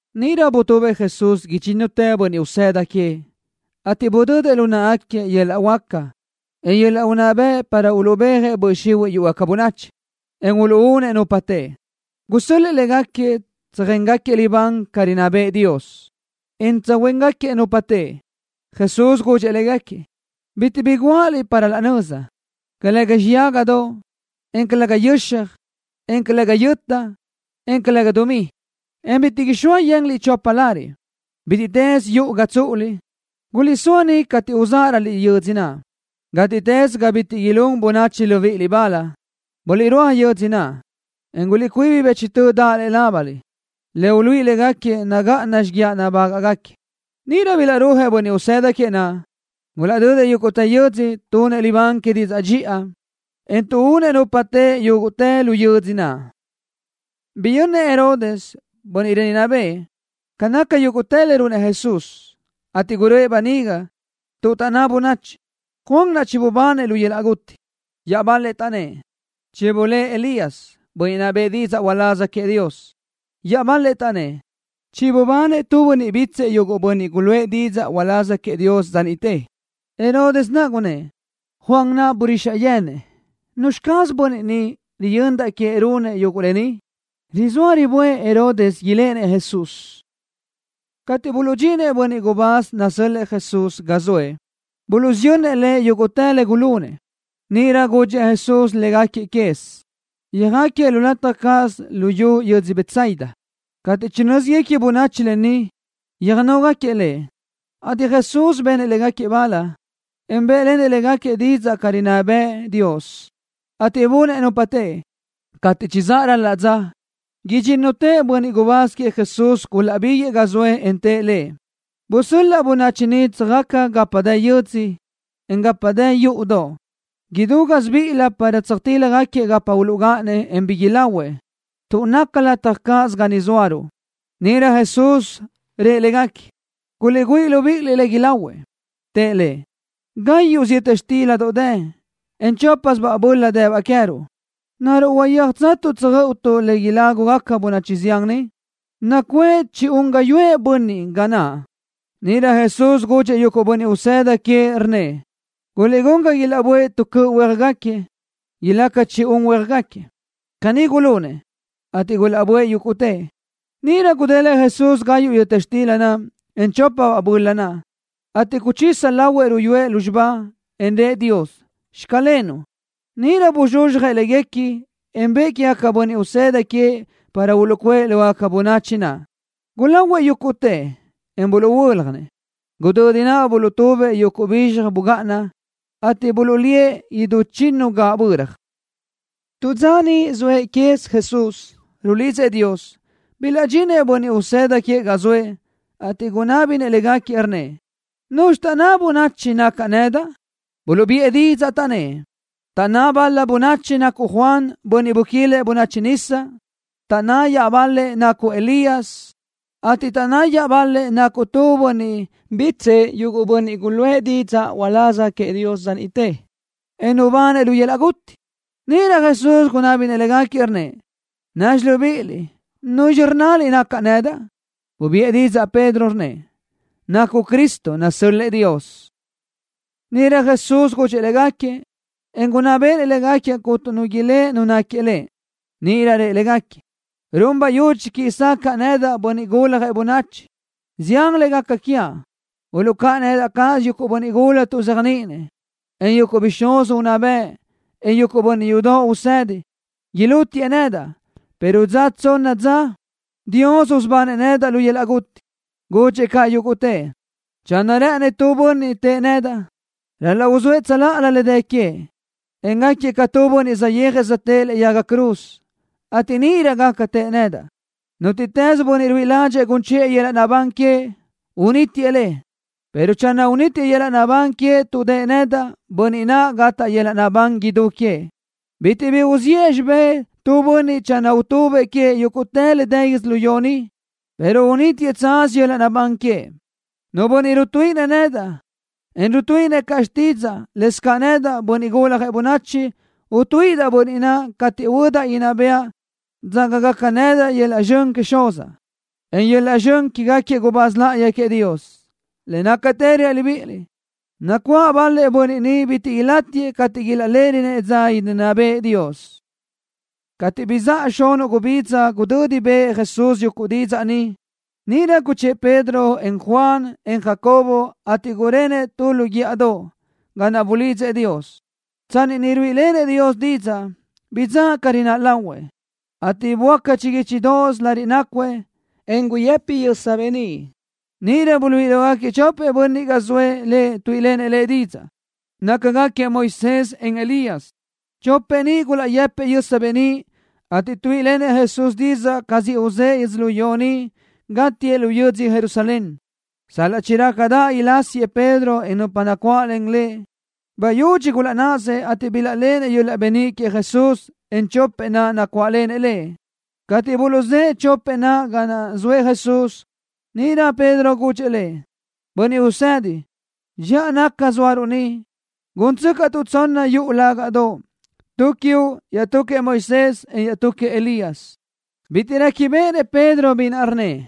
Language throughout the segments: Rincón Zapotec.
Níʼirö butubëʼ Jesús idxínnutëʼ bönniʼ usëda queëʼ, ateʼ budödëʼ lu náʼagaquiëʼ yöl-laʼ huáca, en yöl-laʼ unná bëʼ para uluʼbéajëʼ böʼ xihuiʼ yúʼugaca bönachi, en uluʼúnëʼ nupa teʼe. Gusö́l-lëʼë légaquiëʼ tsöjéngaquiëʼ libán ca rinná bëʼë Dios, en tsöjhuéngaquiëʼ nupa teʼe. Jesús gudxëʼ légaquiëʼ: —Bitiʼ bi guáʼaliʼ para laʼ nöza, calëga xiyágadoʼ, en calëga yöxaj, en calëga yöta, en calëga dumí, en bitiʼ ixóa yenliʼ chopa lariʼ. Bítiʼtës yuʼu ga tsúʼuliʼ, guliʼsóa niʼ cateʼ uzáʼaröliʼ yödzö naʼ. Gátiʼtës ga bitiʼ ilún bönachi libíʼiliʼ bal, buliʼrúaj yödzö naʼ, en guliʼcuíbi bëchtö daʼ lëʼe lábaliʼ, le uluíʼi légaquiëʼ nagáʼana xíguiaʼ nabágaʼgaquiëʼ. Níʼirö bilaʼrúajëʼ bönniʼ usëda queëʼ naʼ. Gulaʼdödëʼ yúguʼtë yö́dzödoʼ, tunëʼ libán que didzaʼ dxiʼa, en tuʼúnëʼ nupa teʼe yúguʼtë lu yödzö naʼ. Biyönnëʼ Herodes, bönniʼ rinná bëʼë, ca naca yúguʼtë le runëʼ Jesús, ateʼ guröʼë böniga, tuʼ taʼnná bönachi: —Juan naʼ chibubanëʼ lu yöl-laʼ guti. Iaʼbal-lëʼ taʼnnë́ʼ: —Chibulë́ʼë Elías, bönniʼ naʼ bëʼë didzaʼ uláz queëʼ Dios. Iaʼbal-lëʼ taʼnnë́ʼ: —Chibubanëʼ tu bönniʼ bítsëʼë yuguʼ bönniʼ guluʼë didzaʼ uláz queëʼ Dios dza niʼte. Herodes naʼ gunnë́ʼ: —Juan naʼ burixaʼ yenëʼ. ¿Nuzxi caz bönniʼ ni, riyöndaʼ queëʼ runëʼ yuguʼ lë ni? Rizóa riböʼë Herodes iléʼenëʼ Jesús. Cateʼ buluʼdxinëʼ bönniʼ gubáz nasö́l-lëʼë Jesús ga zoëʼ Lëʼ, buluʼsiyönnëʼ Lëʼ yúguʼtë le gulunëʼ. Níʼirö guchë́ʼë Jesús légaquiëʼ quez. Yöjáquiëʼ tu lataj cáʼasö lu xiyú yödzö Betsaida. Cateʼ chinö́ziguequi bönachi lë ni, yöjnóguequi Lëʼ, ateʼ Jesús benëʼ léguequi bal, en bë́ʼlenëʼ léguequi didzaʼ ca rinná bëʼë Dios, ateʼ bunëʼ nupa teʼe. Cateʼ chizáʼ ral-la dza naʼ, idxínnutëʼ bönniʼ gubáz queëʼ Jesús gulaʼbíguëʼë ga zoëʼ, en tëʼ Lëʼ: —Busöl-laʼ bönachi ni tsöjaca gapa dë yö́dzödoʼ, en gapa dë yúʼudoʼ idú gásibiʼilö para tsöjtíljagaquiëʼ gapa uluʼgáʼanëʼ, en bi ilahuëʼ, tuʼ naca lataj cáʼasö ga ni zóaruʼ. Níʼirö Jesús rëʼ légaquiëʼ: —Guliʼguʼë libíʼiliʼ le ilahuëʼ. Tëʼ Lëʼ: —Gáyuʼsö yöta xtíladoʼ dë, en chópasöbaʼ böla dëbaʼ queë́tuʼ, o ¿naruʼ huayéajtsatuʼ tsöjö́ʼöutuʼ le ilágugaca bönachi zián ni? Nacuʼë ca chi-un gáyuʼë bönniʼ ga naʼ. Níʼirö Jesús gudxëʼ yuguʼ bönniʼ usëda queëʼ, rnnëʼ: —Guliʼgún ga ilaʼböʼë tu cöʼ huéajgaquiëʼ, ilaca ca chi-un huéajgaquiëʼ. Caní gulunëʼ, ateʼ gulaʼböʼë yúguʼtëʼ. Níʼirö gudélëʼë Jesús gayuʼ yöta xtila naʼ, en chópabaʼ böla naʼ, ateʼ guchisa lahuëʼ ruyúëʼ lúzxiba, en rëʼ Dios: “Xclenuʼ.” Níʼirö buzxuzxjëʼ léguequi, en bëʼë quégaquiëʼ bönniʼ usëda queëʼ para uluʼcuʼë lógaca bönachi naʼ. Gulahuëʼ yúguʼtëʼ, en buluʼhuö́ljanëʼ. Gudödi naʼ buluʼtubëʼ yuguʼ bizxaj bugáʼana, ateʼ buluʼlíëʼ idú chinnu gaʼböra. Tu dza tsanni niʼ zoëʼ quez Jesús, rulidzëʼ Dios, bilaʼdxinëʼ bönniʼ usëda queëʼ ga zoëʼ, ateʼ gunábinëʼ légaquiëʼ, rnnëʼ: —¿Nuzxi taʼnná bönachi nacaʼ nedaʼ? Buluʼbiʼë didzaʼ, taʼnnë́ʼ: —Taʼnná bal-la bönachi nacuʼ Juan, bönniʼ buquilëʼ bönachi nisa. Taʼnná iaʼbal-lëʼ nacuʼ Elías, ateʼ taʼnná iaʼbal-lëʼ nacuʼ tu bönniʼ bítsëʼë yuguʼ bönniʼ guluʼë didzaʼ uláz queëʼ Dios dza niʼte, en nubanëʼ lu yöl-laʼ guti. Níʼirö Jesús gunábinëʼ légaquiëʼ, rnnëʼ: —Názxi libíʼiliʼ, ¿nuzxi rnnaliʼ nacaʼ? Bubiʼë didzaʼ Pedro, rnnëʼ: —Nacuʼ Cristo nasö́l-lëʼë Dios. Níʼirö Jesús gúdxidëʼë légaquiëʼ, en gunná béʼenëʼ légaquiëʼ cuntu nu ilë́ʼ Nu náquiëʼ Lëʼ. Níʼirö rëʼ légaquiëʼ: —Run bayudxi quiʼi sacaʼa nedaʼ, Bönniʼ Guljëʼ Bönachi, zián le gaca quiaʼ. Uluʼcáʼanëʼ nedaʼ cáʼasö yuguʼ bönniʼ gula tuʼzéajniʼinëʼ, en yuguʼ bixúz unná bëʼ, en yuguʼ bönniʼ yudoʼ usedi. Ilútiëʼ nedaʼ, pero dza tsonna dza Dios usubanëʼ nedaʼ lu yöl-laʼ guti. Gudxëʼ caʼ yúguʼtëʼ: —Channö rë́ʼënëʼ nu bönniʼ tëʼë nedaʼ, ral-laʼ uzóëʼ tsöláʼalö le dë queëʼ, en gáquiëʼ ca tu bönniʼ saʼyéajëʼ söjtë́ʼë lëʼe yaga cruz, ateʼ níʼirö gaca tëʼë nedaʼ. Nútiʼtës bönniʼ ruíʼi ládxëʼë gun chiʼë yöl-laʼ naʼbán queëʼ, unítiëʼ le, pero channö unítiëʼ yöl-laʼ naʼbán queëʼ tuʼ dëʼë nedaʼ, bönniʼ ni gataʼ yöl-laʼ naʼbán idú queëʼ. Bitiʼ bi uziʼë xibé tu bönniʼ channö utubëʼ queëʼ yúguʼtë le dë yödzölió ni, pero unítiëʼ tsaz yöl-laʼ naʼbán queëʼ. Nu bönniʼ rutuíʼinëʼ nedaʼ, en rutuíʼinëʼ caʼ xtídzaʼa, lëscaʼ nedaʼ, Bönniʼ Guljëʼ Bönachi, utuíʼidaʼ bönniʼ naʼ cateʼ huödaʼ idinná bëʼa, dzágagaca nedaʼ yöl-laʼ zxön queëʼ Xuzaʼ, en yöl-laʼ zxön quégaquiëʼ gubáz láʼayi queëʼ Dios. Le nácatë reaʼ libíʼiliʼ, nacuáʼ bal-lëʼ bönniʼ ni bitiʼ ilátiëʼ cateʼ ilaʼléʼerönëʼ dza idinná bëʼë Dios. Cateʼ bizáʼa xunuʼ gubidza gudödi bëʼë Jesús yuguʼ didzaʼ ni, níʼirö guchë́ʼë Pedro, en Juan, en Jacobo, ateʼ gurenëʼ tu lu guíʼadoʼ, ga naʼ bulidzëʼ Dios. Tsanni niʼ ruíʼilenëʼ Dios didzaʼ, bidzáʼ ca rináʼ lahuëʼ, ateʼ böáca chiguíchidoʼos lariʼ nácuëʼ, en guyëpi yösa beníʼ. Níʼirö buluʼluíʼi lógaquiëʼ chopëʼ bönniʼ ga zoëʼ Lëʼ tuíʼilenëʼ Lëʼ didzaʼ. Nácagaquiëʼ Moisés, en Elías. Chopëʼ ni gulaʼyëpëʼ yösa beníʼ, ateʼ tuíʼilenëʼ Jesús didzaʼ ca siʼ uzë́ʼë yödzölió ni, gátiëʼ lu yödzö Jerusalén. Sal-laʼ chirácadaʼ ilásiëʼ Pedro, en nupa nacuáʼlen lëʼ, bayudxi gulaʼnáʼasëʼ, ateʼ bilaʼléʼenëʼ yöl-laʼ beníʼ queëʼ Jesús, en chopëʼ naʼ nacuáʼlenëʼ Lëʼ. Cateʼ buluʼzë́ʼë chopëʼ naʼ ga naʼ zoëʼ Jesús, níʼirö Pedro gudxëʼ Lëʼ: —Bönniʼ Usedi, dxiʼa naca zóaruʼ ni. Gúntsöcaʼtuʼ tsonna yuʼu lágaʼdoʼ, tu quiuʼ, iaʼtú queëʼ Moisés, en iaʼtú queëʼ Elías. Bitiʼ réquibeʼenëʼ Pedro bi naʼ rnnëʼ.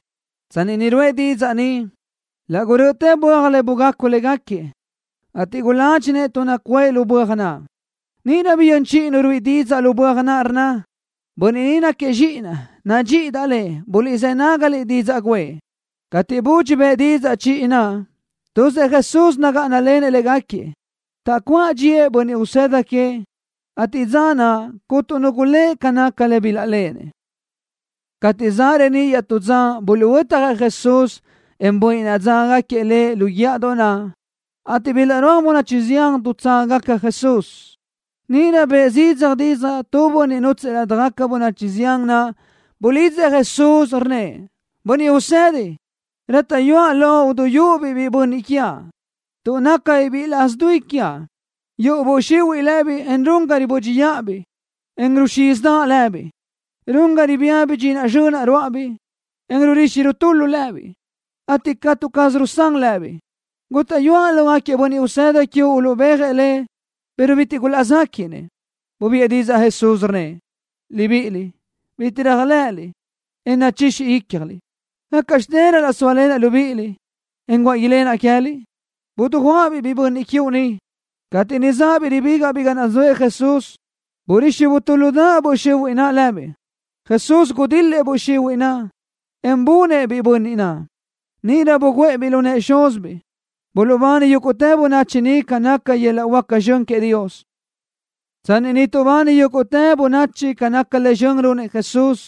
Tsanni niʼ ruʼë didzaʼ ni, laʼ gurö́ʼötë böaj le bugacu légaquiëʼ, ateʼ guládxinëʼ tuʼ nacuʼë lu böaj naʼ. Níʼirö biyö́n chiʼi Nu ruíʼi didzaʼ lu böaj naʼ, rnna: —Bönniʼ ni náquiëʼ Zxíʼinaʼ. Nadxíʼidaʼ Lëʼ. Buliʼzë́ nágaliʼ didzaʼ guʼë. Cateʼ budxi bëʼ didzaʼ chiʼi naʼ, tuzëʼ Jesús nagáʼanalenëʼ légaquiëʼ. Taʼcuáʼ dxíëʼ bönniʼ usëda queëʼ, ateʼ dza naʼ cuntu nu gulë́ʼ ca naca le bilaʼléʼenëʼ. Cateʼ zaʼ reníʼ iaʼtú dza buluʼhuötjëʼ Jesús, en bönniʼ naʼ dzágagaquiëʼ Lëʼ lu guíʼadoʼ naʼ, ateʼ bilaʼrúaj bönachi zián dutságagaca Jesús. Níʼirö bëʼë zidzaj didzaʼ tu bönniʼ nútsëʼë ladaj bönachi zián naʼ. Bulidzëʼ Jesús, rnnëʼ: —Bönniʼ Usedi, rátaʼyuaʼ loʼ duyúʼ-biʼ biʼi bönniʼ quiaʼ tuʼ nácabiʼ biʼi laʼs dui quiaʼ. Yuʼu böʼ xihuiʼ lëbiʼ le run ga ribö́dxiʼabiʼ, en ruxízidaʼ lëbiʼ. Run ga ribía bidxinaʼ zxönaʼ ruáʼabiʼ, en rurixi rutúludaʼ lëbiʼ, ateʼ catu caz rusán lëbiʼ. Gútaʼyuaʼ lógaquiëʼ bönniʼ usëda quiuʼ uluʼbéajëʼ le, pero bitiʼ gulaʼzéquiʼnëʼ. Bubiʼë didzaʼ Jesús, rnnëʼ: —Libiʼiliʼ, bitiʼ réajlëʼëliʼ, en nachixi ícjaliʼ. ¿Gácaʼxte ral-laʼ sóalenaʼ libíʼiliʼ, en guáʼ ilenaʼ queë́liʼ? Dijuáʼa-biʼ biʼi bönniʼ quiuʼ ni. Cateʼ niʼ záʼabiʼ ribígaʼbiʼ ga naʼ zoëʼ Jesús, burixi butúludaʼ böʼ xihuiʼ naʼ lëbiʼ. Jesús gudil-lëʼ böʼ xihuiʼ naʼ, en bunëʼ-biʼ biʼi bönniʼ naʼ. Níʼirö buguʼë-biʼ lu nëʼë xúzibiʼ. Buluʼbani yúguʼtë bönachi niʼ ca naca yöl-laʼ huáca zxön queëʼ Dios. Tsanni niʼ tuʼbani yúguʼtë bönachi ca naca le zxön runëʼ Jesús,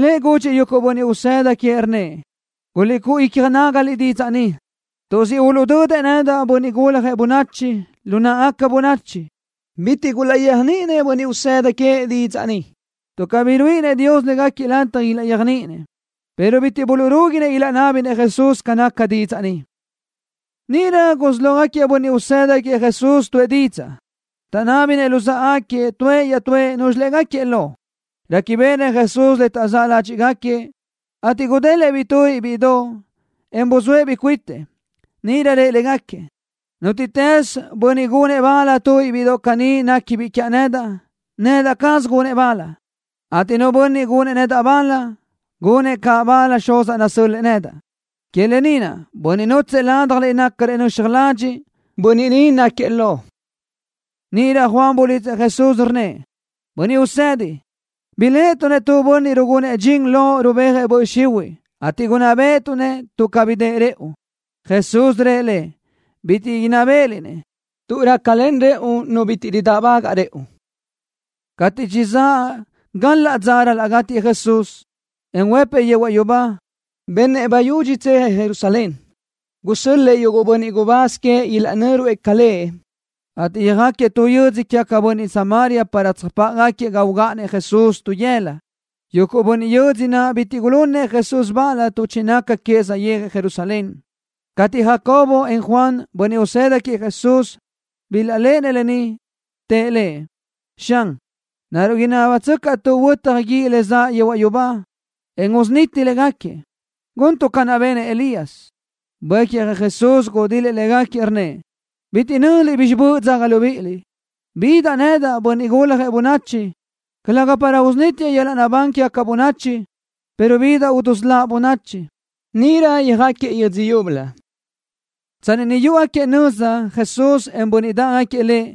Lëʼ gudxëʼ yuguʼ bönniʼ usëda queëʼ, rnnëʼ: —Guliʼcúʼu icja nágaliʼ didzaʼ ni, tuʼ siʼ uluʼdödëʼ nedaʼ, Bönniʼ Guljëʼ Bönachi, lu náʼagaca bönachi. Bitiʼ gulaʼyéajniʼinëʼ bönniʼ usëda queëʼ didzaʼ ni, tuʼ cabí ruíʼinëʼ Dios légaquiëʼ lataj ilaʼyéajniʼinëʼ, pero bitiʼ buluʼrúguinëʼ ilaʼnábinëʼ Jesús ca naca didzaʼ ni. Níʼirö gulaʼsí lógaquiëʼ bönniʼ usëda queëʼ Jesús tuʼë didzaʼ. Taʼnábini luzáʼagaquiëʼ tuëʼ iaʼtúëʼ núzxilëʼ gáquiëʼ lo. Réquibeʼenëʼ Jesús le taʼzáʼ ládxiʼgaquiëʼ, ateʼ gudélëʼë-biʼ tubiʼ bíʼidoʼ, en buzóëʼ-biʼ cuitëʼ. Níʼirö rëʼ légaquiëʼ: —Nútiʼtës bönniʼ gunëʼ bal tu bíʼidoʼ caní tuʼ néquibiʼ quiaʼ nedaʼ, nedaʼ caz gunëʼ bal, ateʼ nu bönniʼ gunëʼ nedaʼ bal, gunëʼ caʼ bal Xuzaʼ nasö́l-lëʼë nedaʼ. Que lë ni naʼ bönniʼ nútsëʼë ládjaliʼ nácarëʼ nöxaj ladxiʼ, bönniʼ ni náquiëʼ lo. Níʼirö Juan bulidzëʼ Jesús, rnnëʼ: —Bönniʼ Usedi, biléʼetuʼ-nëʼ tu bönniʼ rugunëʼ dxin Loʼ rubéajëʼ böʼ xihuiʼ, ateʼ gunná béʼetuʼ-nëʼ tuʼ cabí dëʼë rëʼu. Jesús rëʼ lëʼ: —Bitiʼ inná béʼeliʼ-nëʼ, tuʼ rácalen rëʼu nu bitiʼ ridáʼbagaʼ rëʼu. Cateʼ chizáʼ gal-laʼ dza ral-laʼ gátiëʼ Jesús, en huëpëʼ yehuaʼ yubá, benëʼ bayudxi tsejëʼ Jerusalén. Gusö́l-lëʼë yuguʼ bönniʼ gubáz queëʼ ilaʼnö́ruëʼ ca Lëʼ, ateʼ yöjáquiëʼ tu yö́dzödoʼ quégaca bönachi Samaria para tsöjpáʼagaquiëʼ ga ugáʼanëʼ Jesús tu yëla. Yuguʼ bönniʼ yödzö naʼ bitiʼ gulunëʼ Jesús bal tuʼ chinaca queëʼ saʼyéajëʼ Jerusalén. Cateʼ Jacobo, en Juan, bönniʼ usëda queëʼ Jesús, bilaʼléʼenëʼ lë ni, tëʼ Lëʼ: —Xan, ¿naruʼ inábatsöcaʼtuʼ huötaj guíʼ le zaʼ yehuaʼ yubá, en usuniti légaquiëʼ, guntuʼ ca naʼ benëʼ Elías? Buécjëʼ Jesús, en gudil-lëʼ légaquiëʼ, rnnëʼ: —Bitiʼ nö́ziliʼ bizxi böʼ dzágui libíʼiliʼ. Bidaʼ ni nedaʼ, Bönniʼ Guljëʼ Bönachi, calëga para usunítiaʼ yöl-laʼ naʼbán quégaca bönachi, pero bidaʼ dusöláʼ bönachi. Níʼirö yöjáquiëʼ yödzö yúbölö. Tsanni niʼ yúʼugaquiëʼ nöza Jesús, en yuguʼ bönniʼ dáʼgaquiëʼ Lëʼ,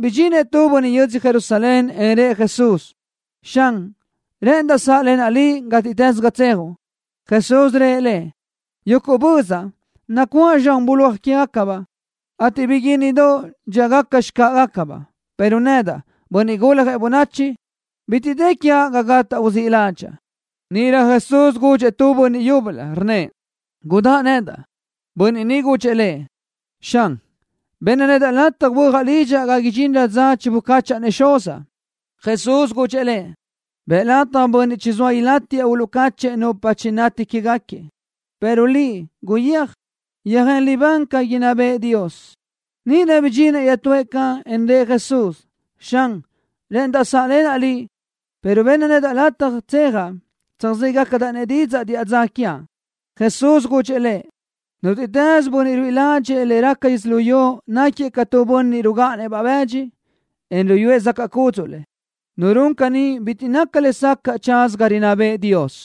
bidxinëʼ tu bönniʼ yödzö Jerusalén, en rëʼ Jesús: —Xan, rë́ʼëndaʼ sáʼlenaʼ Liʼ gátiʼtës ga tsejuʼ. Jesús rëʼ lëʼ: —Yúguʼ bözaʼ, nacuáʼ zxan bulóaj quégacabaʼ, ateʼ biguínnidoʼ, dxíagaca xcáʼagacabaʼ, pero nedaʼ, Bönniʼ Guljëʼ Bönachi, bitiʼ dë quiaʼ ga gátaʼa uzíʼ ládxaʼa. Níʼirö Jesús gudxëʼ tu bönniʼ yúbölö, rnnëʼ: —Gudáʼ nedaʼ. Bönniʼ ni gudxëʼ Lëʼ: —Xan, benna nedaʼ lataj huöjaʼ lidxaʼ ga idxinrö dza chibucáchaʼa-nëʼ xuzaʼ. Jesús gudxëʼ lëʼ: —Bëʼ lataj bönniʼ chizóa ilátiëʼ uluʼcáchëʼë nupa chinati quégaquiëʼ, pero liʼ, guyéaj, yöjén libán ca inná bëʼë Dios. Níʼirö bidxinëʼ iaʼtúëʼ caʼ, en rëʼ Jesús: —Xan, rë́ʼëndaʼ sáʼlenaʼ Liʼ, pero benna nedaʼ lataj tsejaʼ tsöjzégacadaʼ-nëʼ didzaʼ diʼa dza quiaʼ. Jesús gudxëʼ lëʼ: —Nútiʼtës bönniʼ ruíʼi ládxëʼë le raca yödzölió náquiëʼ ca tu bönniʼ rugáʼanëʼ-baʼ bëdxi, en ruyúëʼ zacaʼ cúdzuʼlëʼ. Nu run caní bitiʼ naca lesacaʼ tsaza ga rinná bëʼë Dios.